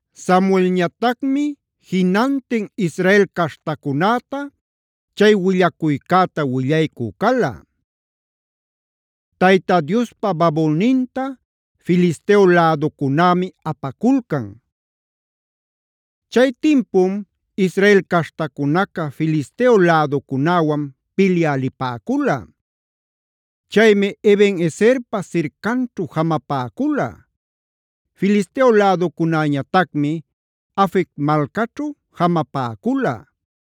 Samuelñatacmi jinantin Israel caśhtacunäta chay willacuycäta willaycü cala. Tayta Diospa babulninta Filisteo läducunämi apaculcan Chay timpum Israel caśhtacunaca Filisteo läducunäwan pilyä lipäcula. Chaymi Eben-ezerpa sircanćhu jamapäcula. Filisteo läducunäñatacmi Afec malcaćhu jamapäcula.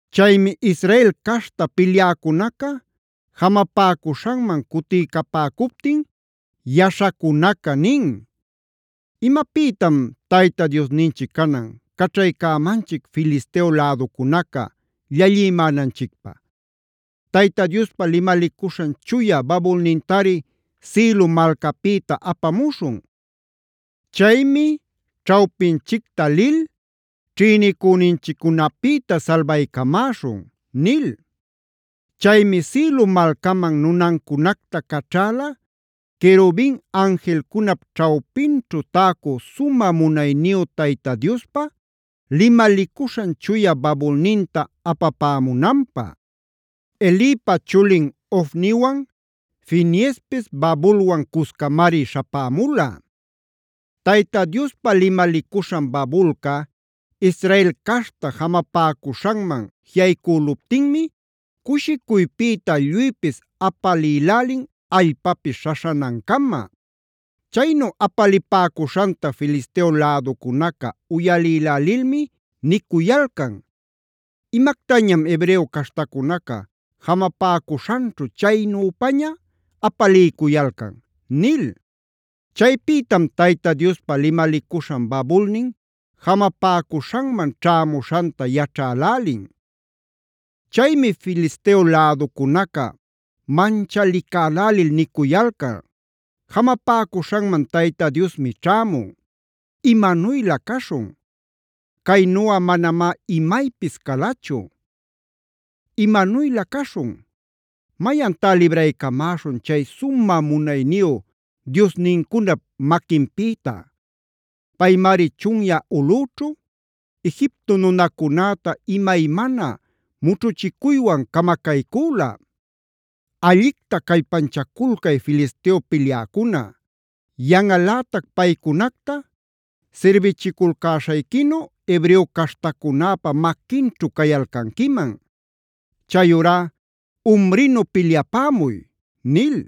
Chaymi Israel caśhta pilyäcunaca jamapäcuśhanman cutiycapäcuptin yaśhacunaca nin: “¿Imapïtam Tayta Diosninchic canan caćhaycämanchic Filisteo läducunaca llallimänanchicpä? Tayta Diospa limalicuśhan chuya babulnintari Silo malcapïta apamuśhun. Chaymi ćhawpinchicta lil ćhïnicüninchiccunapïta salbaycamäśhun” nil. Chaymi Silo malcaman nunancunacta caćhäla querubin anjilcunap ćhawpinćhu täcu sumä munayniyu Tayta Diospa limalicuśhan chuya babulninta apapämunanpä.a Elipa chulin Ofniwan Fineespis babulwan cuscamari śhapämula. Tayta Diospa limalicuśhan babulca Israel caśhta jamapäcuśhanman jiꞌaycüluptinmi cushicuypïta lluypis apalïlälin allpapis śhaśhanancama. Chaynu apalipäcuśhanta Filisteo läducunaca uyalïlälilmi nicuyalcan: “¿Imactañam hebreo caśhtacunaca jamapäcuśhanćhu chaynüpaña apalïcuyalcan?” nil. Chaypïtam Tayta Diospa limalicuśhan babulnin jamapäcuśhanman ćhämuśhanta yaćhälälin. Chaymi Filisteo läducunaca manchalicälälil nicuyalcan: “Jamapäcuśhanman Tayta Diosmi ćhämun. ¡Imanuylä caśhun! ¡Caynuꞌa manamá imaypis calachu! ¡Imanuylä caśhun! ¿Mayantá libraycamäśhun chay sumä munayniyu diosnincunap maquinpïta? ¡Paymari chunyä ulꞌüćhu Egipto nunacunäta imaymana mućhuchicuywan camacaycüla! ¡Allicta callpanchaculcay Filisteo pilyäcuna! ¡Yanꞌalätac paycunacta sirbichiculcäśhayquinu hebreo caśhtacunäpa maquinćhu cayalcanquiman! ¡Chayurá umrinu pilyapämuy!” nil.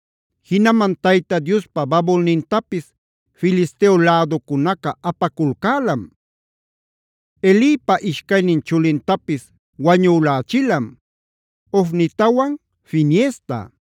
Jinaman Tayta Diospa babulnintapis Filisteo läducunaca apaculcälam. Elipa ishcaynin chulintapis wañülächilam: Ofnitawan Fineesta.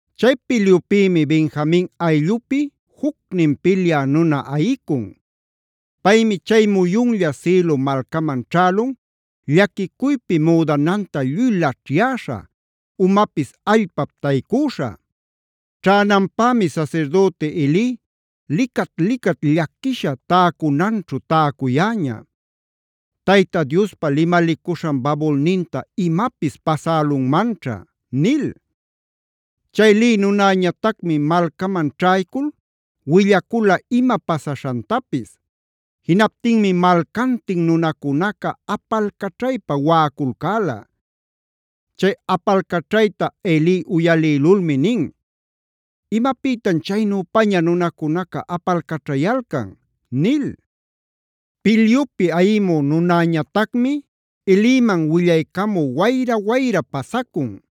Chay pilyupïmi Benjamin ayllupi jucnin pilyä nuna ayicun. Paymi chay muyunlla Silo malcaman ćhälun llaquicuypi müdanan lluy laćhyäśha, umapis allpap taycüśha. Ćhänanpämi sasirdüti Eli licat-licat llaquisha täcunanćhu täcuyäña: “Tayta Diospa limalicuśhan babulninta imapis pasälunmanćha” nil. Chay lï nunäñatacmi malcaman ćhaycul willacula ima pasaśhantapis. Jinaptinmi malcantin nunacunaca apalcaćhaypa waꞌaculcäla. Chay apalcaćhayta Eli uyalïlulmi nin: “¿Imapïtam chaynüpaña nunacunaca apalcaćhayalcan?” nil. Pilyupi ayimü nunäñatacmi Eliman willaycamü wayra-wayra pasacun.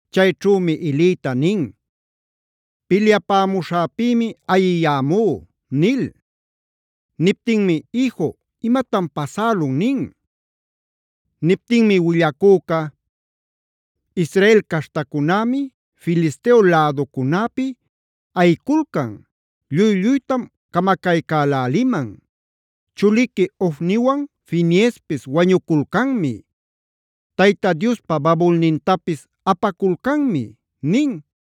Chayćhümi Elita nin: “Pilyapämuśhäpïmi ayiyämú” nil. Niptinmi: “Iju, ¿imatan pasälun?” nin. Niptinmi willacüca: “Israel caśhtacunämi Filisteo läducunäpi ayiculcan. Lluy-lluytam camacaycäläliman. Chuliqui Ofniwan Fineespis wañuculcanmi. Tayta Diospa babulnintapis apaculcanmi” nin.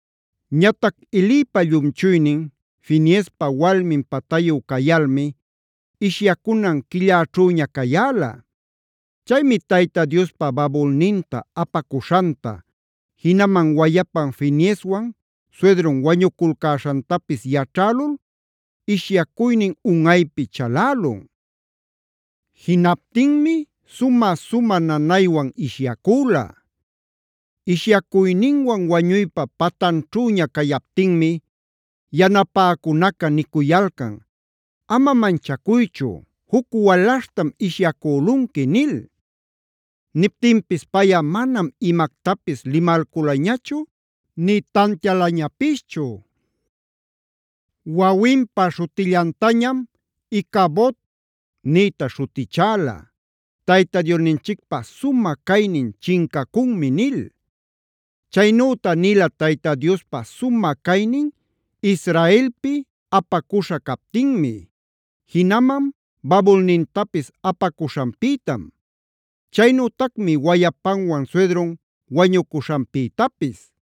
Ñatac Elipa llumchuynin, Fineespa walmin patayu cayalmi ishyacunan quillaćhüña cayäla. Chaymi Tayta Diospa babulninta apacuśhanta, jinaman wayapan Fineeswan suydrun wañuculcäśhantapis yaćhälul ishyacuynin unꞌaypi chalälun. Jinaptinmi sumä-sumä nanaywan ishyacüla. Ishyacuyninwan wañuypa pantanćhüña cayaptinmi yanapäcunaca nicuyalcan: “Ama manchacuychu, juc walaśhtam ishyacülunqui” nil. Niptinpis payꞌa manam imactapis limalculañachu, nï tantialañapischu. Wawinpa śhutillantañam Icabodb nïta śhutichäla: “Tayta Diosninchicpä sumä caynin chincacunmi” nil. Chaynüta nila Tayta Diospa sumä caynin Israelpi apacuśha captinmi. Jinaman babulnintapis apacuśhanpïtam; chaynütacmi wayapanwan suydrun wañucuśhanpïtapis.